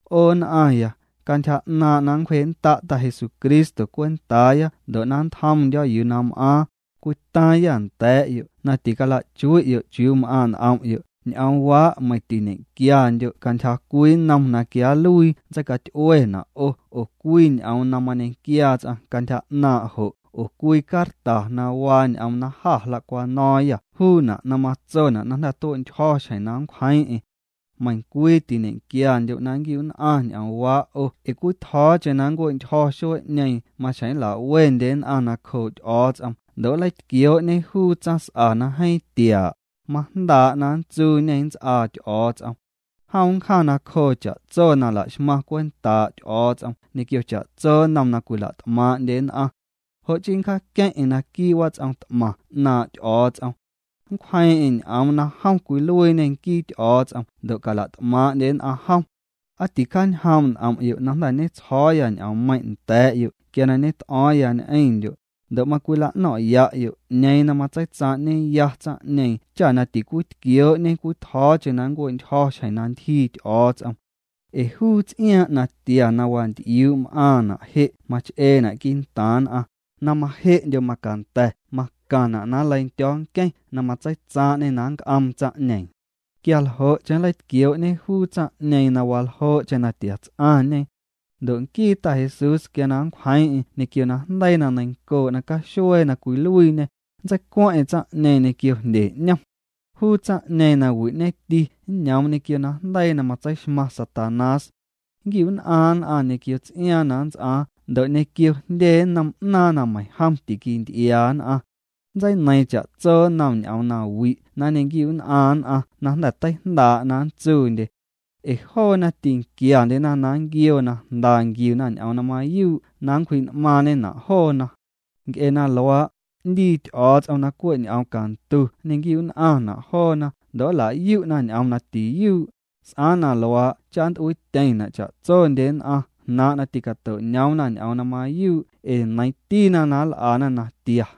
'O nn'aaⁿya, cantyja 'naaⁿ' na nncwjee'nnda' Ta Jesucristo cwentaaya ndo' na nntjomndyo̱ yuu na m'aaⁿ, cwitaaⁿyâ nda̱a̱'yo' na tilachui'yo' chiuu m'aaⁿ' n'om'yo' ñ'oomwaa' meiⁿ tiñequiandyo' cantyja cwii nnom na quia nluii nntseicaty'uena' 'o oo cwii ñ'oom na mañequiaa ts'aⁿ cantyja 'naaⁿ' jo' oo cwii carta na waa ñ'oom na jâ jla'cwano̱o̱ⁿyâ juuna' na matsona' na jnda̱ tue'ntyjo̱ xjeⁿ na nncwjeeⁿ'eⁿ. Meiⁿcwii tiñe'quiandyo' na nnquiu'nn'aⁿ ñ'oomwaa' 'o ee cwitjo̱o̱cheⁿ na nncue'ntyjo̱ xuee'ñeeⁿ maxjeⁿ nla'wendye nn'aⁿ nacjoo' Ty'o̱o̱ts'om ndo' nleitquioo'ñe juu tsaⁿs'a na jeeⁿ tiaa', majndaa' na nntsuuñê nnts'aa Ty'o̱o̱ts'om. Jom nncjaⁿ nacjoo cha'tso na la'xmaⁿ cwentaa' Ty'o̱o̱ts'om ñequio cha'tso nnom na cwila't'maaⁿ'ndye nn'aⁿ. Jo' chii ncjaaqueⁿ'eⁿ naquii' wats'om t'maⁿ 'naaⁿ' Ty'o̱o̱ts'om. Nncwjeeⁿ'eⁿ ñ'oom na jom cwiluiiñê nquii Ty'o̱o̱ts'om ndo' cala't'maaⁿndye nn'aⁿ jom. ¿Aa ticjaañjoom' n'om'yo' na jnda̱ tsjo̱o̱ya ñ'oommeiⁿ' nda̱a̱'yo' quia na ñet'o̱o̱ⁿya ñ'eⁿndyo'? Ndo' macwila'no̱ⁿ'ya'yo' 'ñeeⁿ na matseitsaaⁿ'ñeya tsaⁿ'ñeeⁿ cha na ticwitquioo'ñe cwitjo̱o̱cheⁿ na nncue'ntyjo̱ xjeⁿ na ntyjii Ty'o̱o̱ts'om. Ee juu ts'iaaⁿ' natia na wanty'iuu' m'aⁿna' je' mach'eena' quii'ntaaⁿ nn'aⁿ, na maje'ndyo macanda̱ macaⁿna' na nleindyo̱o̱ nqueⁿ na matseitsaaⁿ'ñê na nnc'oom tsaⁿ'ñeeⁿ. Quia ljo'cheⁿ nleitquioo'ñe juu tsaⁿ'ñeeⁿ na waljoo'cheⁿ na tia ts'aⁿñe. Ndo' nquii Ta Jesús quia na nncwjeeⁿ'eⁿ ñequio najndeii na neiⁿncoo' nacaxuee na cwiluiiñê, nntseicueeⁿ'eⁿ tsaⁿ'ñeeⁿ ñequio jndye 'ñom. Juu tsaⁿ'ñeeⁿ na wi'ñeti nñoom ñequio najndeii na matseixmaⁿ Satanás. Nnquiu'nn'aaⁿ nn'aⁿ ñequio ts'iaaⁿ na nnts'aaⁿ ndo' ñequio jndye nnom 'naaⁿ na meiⁿjom tiquinty'iaa nn'aⁿ. Nntseineiiⁿ cha'tso nnom ñ'oom na wi' na nñequiu'nn'aaⁿ nn'aⁿ na jnda̱ teijndaa' na nntsuundye. Ee joona tînquiandyena na nnquioo na jnda nquiuna ñ'oom na mayuu' na nncwji'n'maaⁿñena' joona. Nc'e na luaa', 'ndii Ty'o̱o̱ts'om na cwe' ñ'oom cantu nñe'quiu'nn'aⁿna' joona ndo' nla'yu'na ñ'oom na tiyuu', s'aaⁿ na luaa' cha nnt'uiityeⁿna' cha'tsondye nn'aⁿ jnaaⁿ' na ti'cato'ñoomna ñ'oom na mayuu' ee neiiⁿtina na nl'ana natia.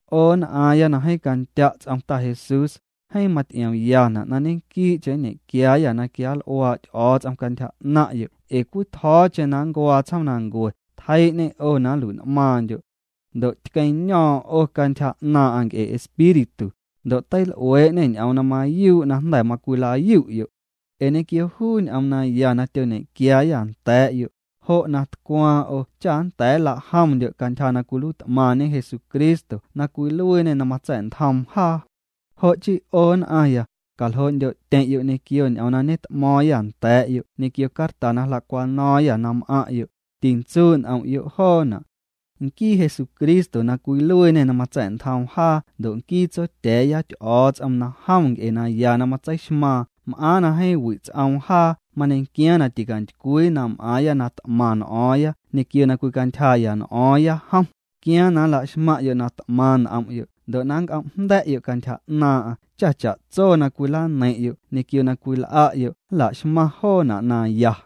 'O nn'aaⁿya na jeeⁿ candya' ts'om Ta Jesús, jeeⁿ maty'iomyana' na ñequii'cheⁿ nñequiaayâ na quial'uaa' Ty'o̱o̱ts'om cantyja 'naⁿ'yo' ee cwitjo̱o̱cheⁿ na nncuaa tsjoomnancue tjeii'ñê 'o na nlui'n'maaⁿndyo'. Ndo' tqueⁿño̱o̱ⁿ 'o cantyja 'naaⁿ'aⁿ nc'e Espíritu, ndo' teil'uee'ñê ñ'oom na mayuu' na jnda̱ macwila'yu'yo'. Ee ñequio juu ñ'oom naya na tyoñequiaayâ nda̱a̱'yo', jo' na tcwaaⁿ 'o cha nnda̱a̱ nla'jomndyo' cantyja na cwiluiit'maⁿñe Jesucristo na cwiluiiñê na matsa̱'ntjoom jaa. Jo' chii 'o nn'aⁿya, caljoo'ndyo'tyeⁿ'yo' ñequio ñ'oom na ñet'mo̱o̱ⁿyâ nda̱a̱'yo' ñequio carta na jla'cwano̱o̱ⁿyâ na m'aⁿ'yo', tintsuu' n'om'yo' joona'. Nquii Jesucristo na cwiluiiñê na matsa̱'ntjoom jaa ndo' nquii Tsotya̱a̱ya Ty'o̱o̱ts'om na jom nc'e naya na matseixmaaⁿ m'aaⁿ na jeeⁿ wi' ts'oom jaa mañequiaaⁿ na ticantycwii na m'aaⁿya na t'maⁿ n'o̱o̱ⁿya ñequio na cwicantyjaa'ya n'o̱o̱ⁿya jom, quiaaⁿ na nla'xmaⁿ'yo' na t'maⁿ n'om'yo' ndo' na nnc'om' jnda̱'yo' cantyja 'naaⁿ'aⁿ cha cha'tso na cwilaneiⁿ'yo' ñequio na cwil'a'yo' nla'xmaⁿ joona' na ya.